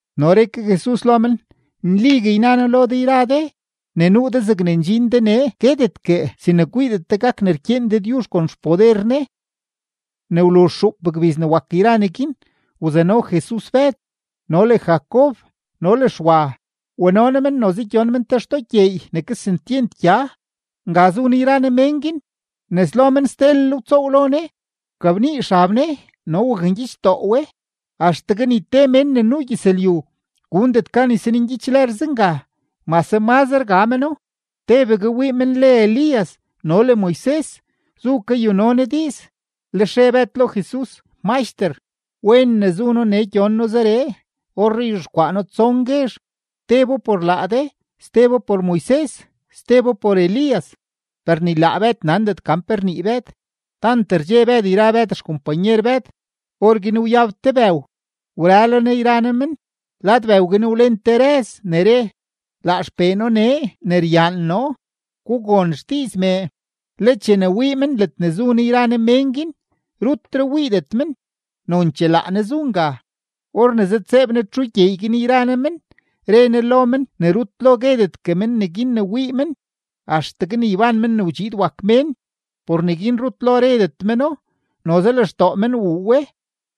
No re ke Jesus lo men: ―Nligue yna noo lo de yra de, ne nuu de zegne ndxin de nee guetetgue sin ne kwiidet de gak ne rkyeen Dëdyuzh kon xpoder Ne. Ne wluzh xuup gbiz ne wak yra neguin, wzano Jesus Bëd no le Jacob no le Xwa, wano Ne men noze gyon men te xtoo gyeey ne kesentyent gya. Nga zu Ne yra Ne mén guin, nes lo men stelel wtsoow lo Ne. Wkabnii xab Ne no wakngyichdoo we, axtegue ni te mén ne nuu gyëzlyu gundet gan ysanngyich lër zenga mase mazre ga meno. Tebegue wii men le Elías no le Moises zu kayuno Ne diiz. Lex re Bëd lo Jesus: ―Maxter, ¡wen ne zu noo nee gyon noo zeree! Orree yzhexkwaa noo tson guezh: tebo por laa de, stebo por Moises, stebo por Elías. Per ni laa Bëd nandet gan pe rnii Bëd, tant rdxe Bëd yra Bëd xkompanyer Bëd. Orguin wyab te bëw, wrëlo Ne yra Ne men. Lad bëw guin wlen te rëz ne re: ―Laa XPee noo nee ne ryaan noo; gugon xdiiz mee. Le chene wii men ledne zu Ne yra Ne mén guin, rutre wiidet men, nonchee laa Ne zu nga. Or ne zëdtseeb Ne txu gyeey guin yra Ne men, re Ne lo men ne rut lo guedetgue men neguin ne wii men axtegue ne yban Men ne wdxiid wak Mén. Por neguin rut lo redet meno, noze lextoo men wuu we;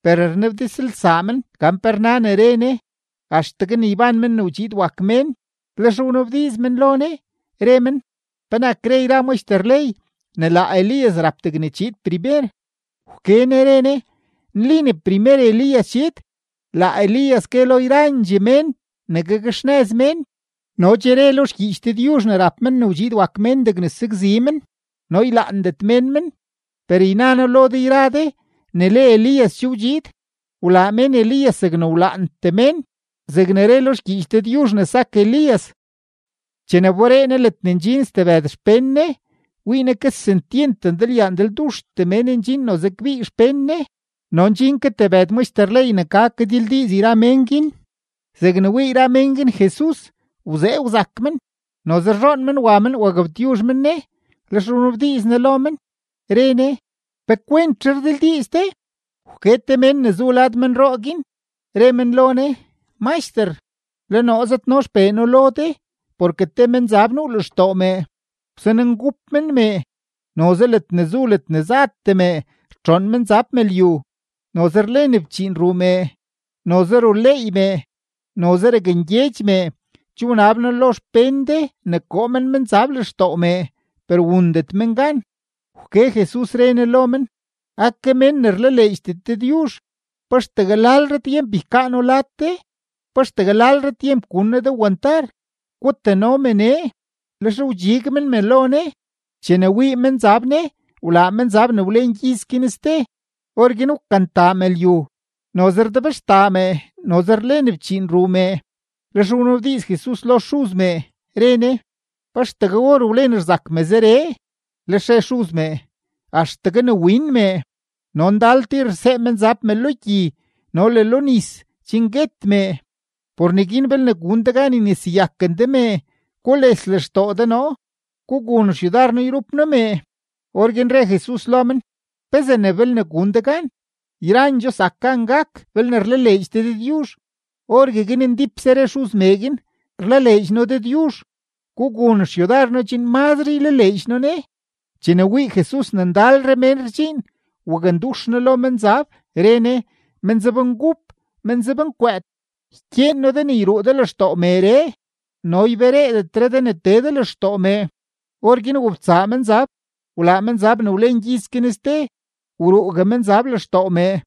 per rnabdizlsaa men gan pe rna ne re Ne, “axtegue ne yban Men ne wdxiid wak Mén”. Lex wnabdiiz men lo Ne, re men: ―¿Penak re yra maxter ley ne laa Elías rap degne chiid primer? Wke Ne re Ne: ―Nli ne primer Elías chiid; laa Elías gue lo yrandxee mén ne gakxnëz mén. No che re lo xgyiich Dëdyuzh ne rap Men ne wdxiid wak Mén degne sakzi men, no ylaandet mén men. Per yna noo lo de yra de ne le Elías che wdxiid, wlaa mén Elías zegne wlaantee mén, zegne re lo xgyiich Dëdyuzh ne sak Elías. Chene wberee Jesus ledne ndxin stebëd xpén Ne, wii Ne kesentyent ndalyaa ndalduxtee mén ndxin noze kbii xpén Ne no ndxin ke tebëd maxter ley ne ka kadildiiz yra mén guin. Zegne wii yra mén guin Jesus, wzee wzak men; noze rzhoon men wa men wagabtyuzh men Ne. Lex wnabdiiz Ne lo men, re Ne: ―¿Pe kwentzhe rdildiiz de? Wke te mén ne zu lad menroo guin, re men lo Ne: ―Maxter, le noo zëdno xpee noo lo de, porke te menzab nuu lextoo mee, wsanengup men mee. Noze ledne zu ledne zatee me rtxoon menzab me lyu; noze rlen fchiin ruu mee, noze ruleey mee, noze rakngyedx mee. Che wnab noo lo xpén de ne koo men menzab lextoo mee, per wundet men gan. Wke Jesus, re Ne lo men: ―¡Ake mén ne rlaleedxdet Dëdyuzh! ¿Pa axtegue lalre tyemp ykaa noo lad de? ¿Pa axtegue lalre tyemp gun noo de wantar? Gutano me nee. Lex wdxig men me lo Ne. Chene wii menzab Ne, wlaa menzab ne wlen gyiz guin ste. Orguin wkantaa me lyu, noze rdebxtaa mee, no noze rlen fchiin ruu mee. Lex wnabdiiz Ne lo xuz mee, re Ne: ―¿Pa axtegue or wlen ne rzak me zeree? Lex re xuz mee: ―Axtegue ne win mee. No ndal tir rsee menzab me lo gyi no le lo nis chen guet mee. Por neguin belne gun de gan yneseyaken de mee, gules lextoo de noo, gugun xyudar noo yrup noo mee. Orguin re Jesus lo men: ―¿Pezee ne “belne gun de gan”? ¡Yrandxoo zak gan gak belne rlaleedx de Dëdyuzh! Orgueguin ndípse re xuz mee guin: ―¡Rlaleedx noo Dëdyuzh; gugun xyudar noo chen mazre ylaleedx noo Ne! Chene wii Jesus ne ndalre mén rdxiin, wakndux Ne lo menzab, re Ne: ―Menzabngup, menzabnkwëët, ykyeen noo de ne yruu de lextoo meeree, no ybereedetre de tee de lextoo mee. Orguin wobtsaa menzab, wlaa menzab ne wlen gyiz guin ste, wruugue menzab lextoo mee.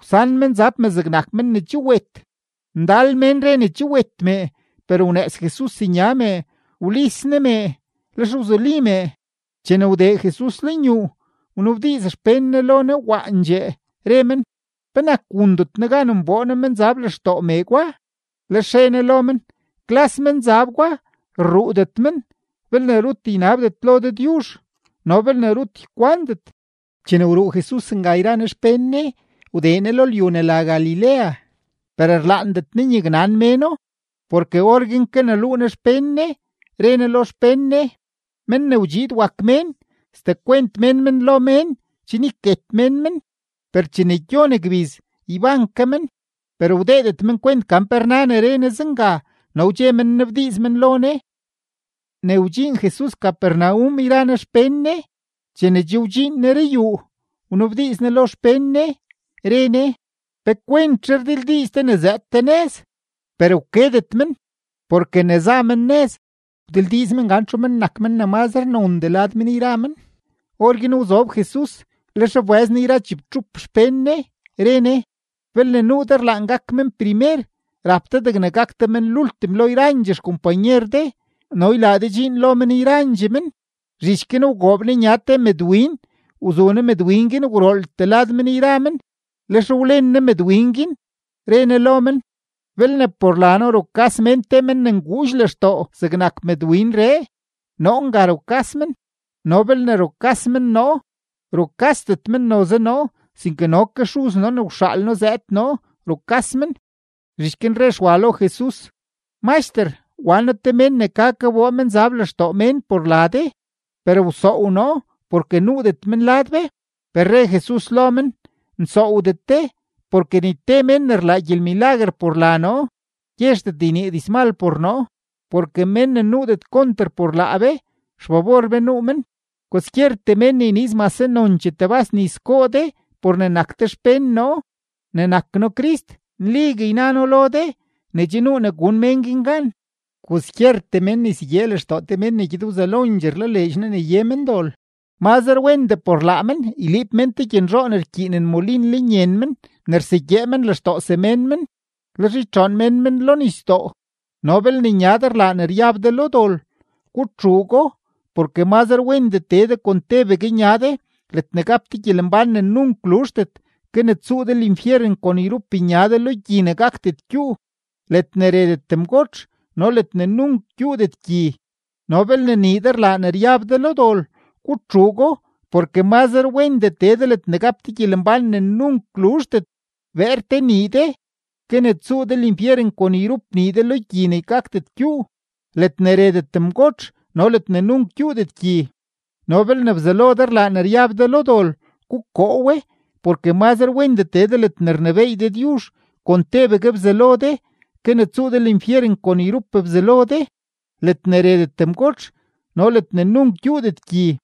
Wsan menzab me zegnak men ne che wet. Ndal mén re ne che wet mee. Per wnëëz Jesus nya mee, wlis Ne mee; lex wzuli mee. Chene wdee Jesus lenyuu, wnabdiiz xpén Ne lo Ne waandxee, re men: ―¿Penak wundet noo gan nboo noo menzab lextoo mee gwa? Lex re Ne lo men: ―Klas menzab gwa rruudet men belne rut ynabdet lo Dëdyuzh no belne rut ykwandet. Chene wruu Jesus nga yra Ne xpén Ne, wdee Ne lo lyu ne la Galilea. Per rlaandet Ne ne nyaknan méno, porke orguin kaneluu Ne xpén Ne, re Ne lo xpén Ne: ―Men ne wdxiid wak Mén, sdekwent mén men lo mén chen yket mén men; per chene gyon gbiz, yban ke men. Per wdeedet men kwent gan pe rna ne re Ne zenga, no wdxe men nnabdiiz men lo Ne. Ne wdxiin Jesus Capernaum yra Ne xpén Ne, chene che wdxiin Ne ruyuu, wnabdiiz Ne lo xpén Ne, re Ne: ―¿Pe kwentzhe rdildiiz de ne zëëd de nëz? Per wkedet men, porke ne za men nëz wdildiiz men gan txu men nak men ne mazre nondee lad men yra men. Orguin wzob Jesus, lex wbëz Ne yra chibtxup xpén Ne, re Ne: ―Belne nuu de rlaan gak men primer, rap de degne gak de men lultim lo yrandxee xkompanyer de no ylaa de dxiin lo men yrandxee men. Zhich guin wgoob Ne nya te mëdwin, wzu Ne mëdwin guin gwrooltee lad men yra men, lex wlen Ne mëdwin guin, re Ne lo men: ―Belne por la noo rukas mén te men ne nguudx lextoo zegnak mëdwinree, noo nga rukas men; no belne rukas men noo, rukasdet men noze noo, sinke no ke Xuz noo ne wxaal noo zëëd noo rukas men. Zhich guin re Xwa lo Jesus: ―Maxter, wan noo te mén ne ka kaboo menzab lextoo mén por la de, per wsoow noo porke nuudet men lad be. Per re Jesus lo men: ―Nsoowdet de; porke ni te mén ne rlaa gyelmilaguer por la noo, gyezhdet ynii dizmal por noo. Porke mén ne nuudet konter por laa be, xfabor be nuu men. Kwaskyertee mén ne yniiz mase nonchee tebas nis goo de por ne nak de xpén noo ne nak noo Crist, nligue yna noo lo de ne che nuu ne gun mén guin gan. ’Kwaskyertee mén ne ysegyee lextoo te men ne gyed wzelondxee rlaleedx noo ne ye men dol, mazre wendee por laa men yliib mén te gyenzhoo ne rkyiinen molin lenyen men ne rsegyee men lextoo semén men, lex ytxoon mén men lo nisdoo. No belne nya de rlaa ne ryab de lo dol, gutxuugo. Porke mazre wendee tee de kon tebegue nya de ledne gap de gyelembán ne nunk luzhdet, ke ne tsuu de linfyeren kon yrup nya de, lo gyi ne gakdet gyuu, ledne retet mgotx no ledne nunk gyuudet gyi. No belne nii de rlaa ne ryab de lo dol, gutxuugo. Porke mazre wendee tee de ledne gap de gyelembán ne nunk luzhdet beer te nii de, ke ne tsuu de linfyeren kon yrup nii de, lo gyi ne gakdet gyuu, ledne retet mgotx no ledne nunk gyuudet gyi. No belne bzalo de rlaa ne ryab de lo dol, gukoo we. Porke mazre wendee tee de ledne rnebééy Dëdyuzh kon tebegue bzalo de, ke ne tsuu de linfyeren kon yrup bzalo de, ledne retet mgotx no ledne nunk gyuudet gyi.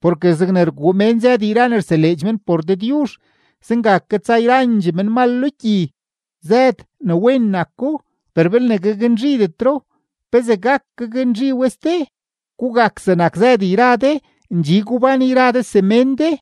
’Porke zegne rguu mén zëd yra ne rseleedx men por Dëdyuzh, zenga ke tsa yrandxee menmal lo gyi. Zëd, ne wen nako; per belne gaknzhidetro, ¿pezee gak gaknzhi we ste? Gugak zegnak zëd yra de, ndxi gubán yra de semén de.